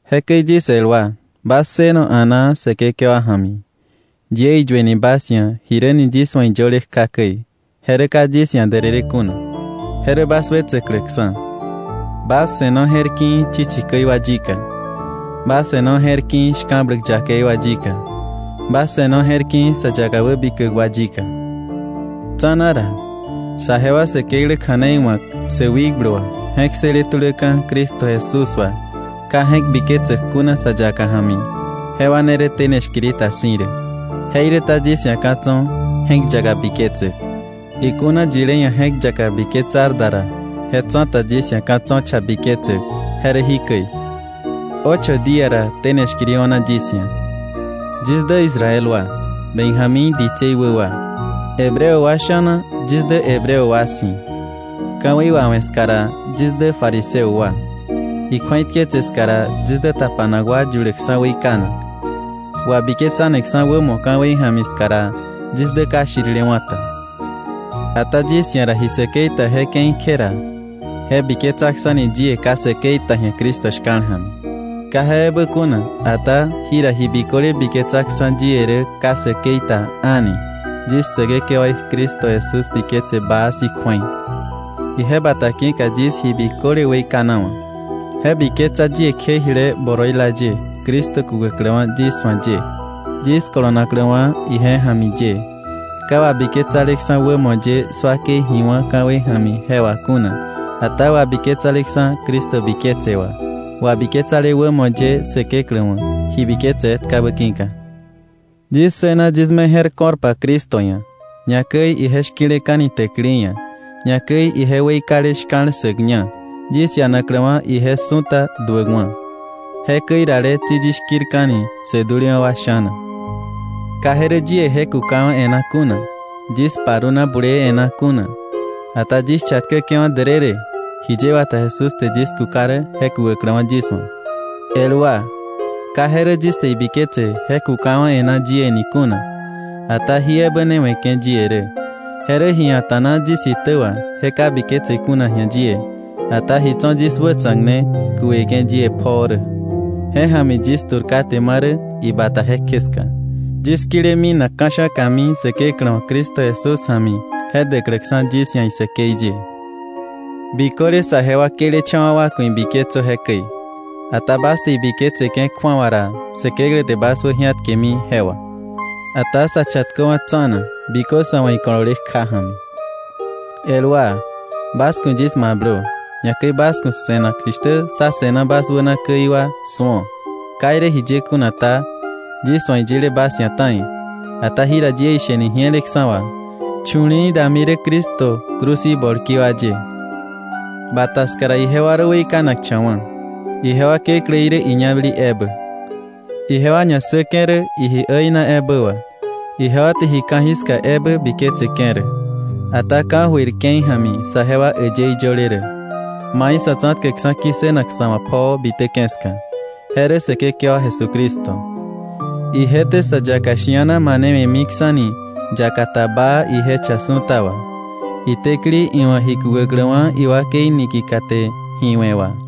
Jekäi yis el wa, bas ssëno a̱naa Säkekewa ja̱mi. Yie iyueni bas ia̱ jiräni yis wa̱ iyöle kja käi, je rä ka yis ia̱ därërë kuna, je rä bas wetsäkläksa̱. Bas se̱no je̱rki̱i̱ chichi käi wa yika. Bas se̱no je̱rki̱i̱ shka̱bläk yakei wa yika. Bas se̱no je̱rki̱i̱ sä yaka wäbikäk wa yika. Tsa̱na ra saje wa Säkeklä kja̱nei wa̱k sä wikblu wà, je̱k ssële tuläka̱ Cristo Jesús wà, ka je̱k biketsäk kuna sa yaka ja̱mi, jewa ne rä tene shkiri ta si̱ rä. Jeiräta yis ia̱ ka̱ tso̱ je̱k yaka biketsäk. Ikuna yilé ia̱ je̱k yaka biketsar da ra, je tsa̱ta yis ia̱ ka̱ tso̱ cha biketsäk, je rä jikäi: ocho día ra tene shkiri o̱na yis ia̱. Yis dä Israel wa, Benjamín ditsei wä wa. Hebreo wa sha̱na yis dä Hebreo wa si̱. Ka̱wei wawe̱ ska ra, yis dä fariseo wa. Ikju̱eitketse ska ra yis dä tapanak wa yuläkksa̱ weikanak. Wabiketsaneksa̱ wämo ka̱wei ja̱mi ska ra, yis dä ka shirilewa̱ ta. Ata yis ia̱ ra ji säkei ta je ke̱i kje ra je biketsaksa̱ni yie ka säkei ta ji̱a Cristo shka̱l ja̱mi. Ka je ebä kuna, ata jira ji biköle biketsaksa̱ yie rä ka säkei ta a̱ni yis Säkekewaí Cristo Jesús biketse baa si̱ kju̱ei. Ije bata ki̱ka yis ji biköle weikanawa̱. Je biketsa yie kje jile boroila ye Cristo kukäkläwa̱ yis wa̱ ye, yis kolonakläwa̱ ije ja̱mi ye, ka wabiketsaleksa̱ wämo ye 'swakei ji wá̱ ka̱wei ja̱mi je wà kuna, ata wabiketsaleksa̱ Cristo biketse wà, wabiketsale wämo ye Säkeklä wa̱, ji biketse etkabä ki̱ka. Yis ssëna yis me je̱r ko̱rpa Cristo ia̱, ñakäi ije shki̱leka̱ni täkili ia̱, ñakäi ije weikale shka̱l ssäkña, yis ianakläwa̱ ije su̱ta duäkwa̱. Jekäi rale tsi yis shki̱rka̱ni sä dulewa̱ wa sha̱na. Ka je rä yie je kukawa̱ e̱ná kuna, yis paruna bulee e̱ná kuna, ata yis chatkäke̱wa̱ därërë, jiye wata Jesús te yis kuka rä je kukäkläwa̱ yis wa̱. El wa, ka je rä yis te ibiketse je kukawa̱ e̱ná yie ni kuna, ata jí ebä ne we̱ke̱ yie rä, je rä ji a̱ta̱na yis itä wà je ka biketse kuna ji̱a yie, ata ji tso̱ yis wätsa̱k ne kukeke̱ yie pjoo rä, je ja̱mi yis tu̱r kate marä ibata jekje ska, yis kile minak ka̱sha̱kami Säkeklä wa̱ Cristo Jesús ja̱mi je däkläksa̱ yis ia̱ isäkei ye. Biköle saje wa këlecha̱wa̱ wa ku̱ ibiketsö jekäi. Ata bas te ibiketseke̱ kju̱awa ra, Säkeklä te bas wäji̱atkewe̱mi je wà. Ata sa chatköwa̱ tsa̱na bikö sa̱ wa̱ ikolole kja ja̱mi. El wa, bas ku̱ yis mablö, ñakäi bas ku̱ se̱nak jishtä sá se̱na bas wänaka käi wa su̱o. Ka irä jiye kuna ta, yis wa̱ iyile bas ia̱ ta̱i, ata jira yie isheni ji̱eleksa̱ wà, chu̱li̱i̱ dami rä Cristo cruz í bolki wa ye. Bata ska ra ijewa rä weikanakcha̱wa̱. Ijewa kekläí rä iñabäli ebä. Ijewa ñassäke̱ rä iji äina ebä wà, ijewa te ji ka̱jiska ebä biketseke̱ rä. Ata ka̱jöir ke̱i ja̱mi saje wa äyëí yöle rä, mai Sa̱tsa̱tkäkksa̱ ki̱ssënak sa̱ wa̱ pjoo bitäke̱ ska, je rä Säkekewa Jesucristo. Ije te sä yaka shi̱ana manewe̱miksa̱ni yaka ta baa ije cha su̱ta wà, itäkili iwa̱ ji kukäkläwa̱ iwakei niki̱ka te ji we̱ wà.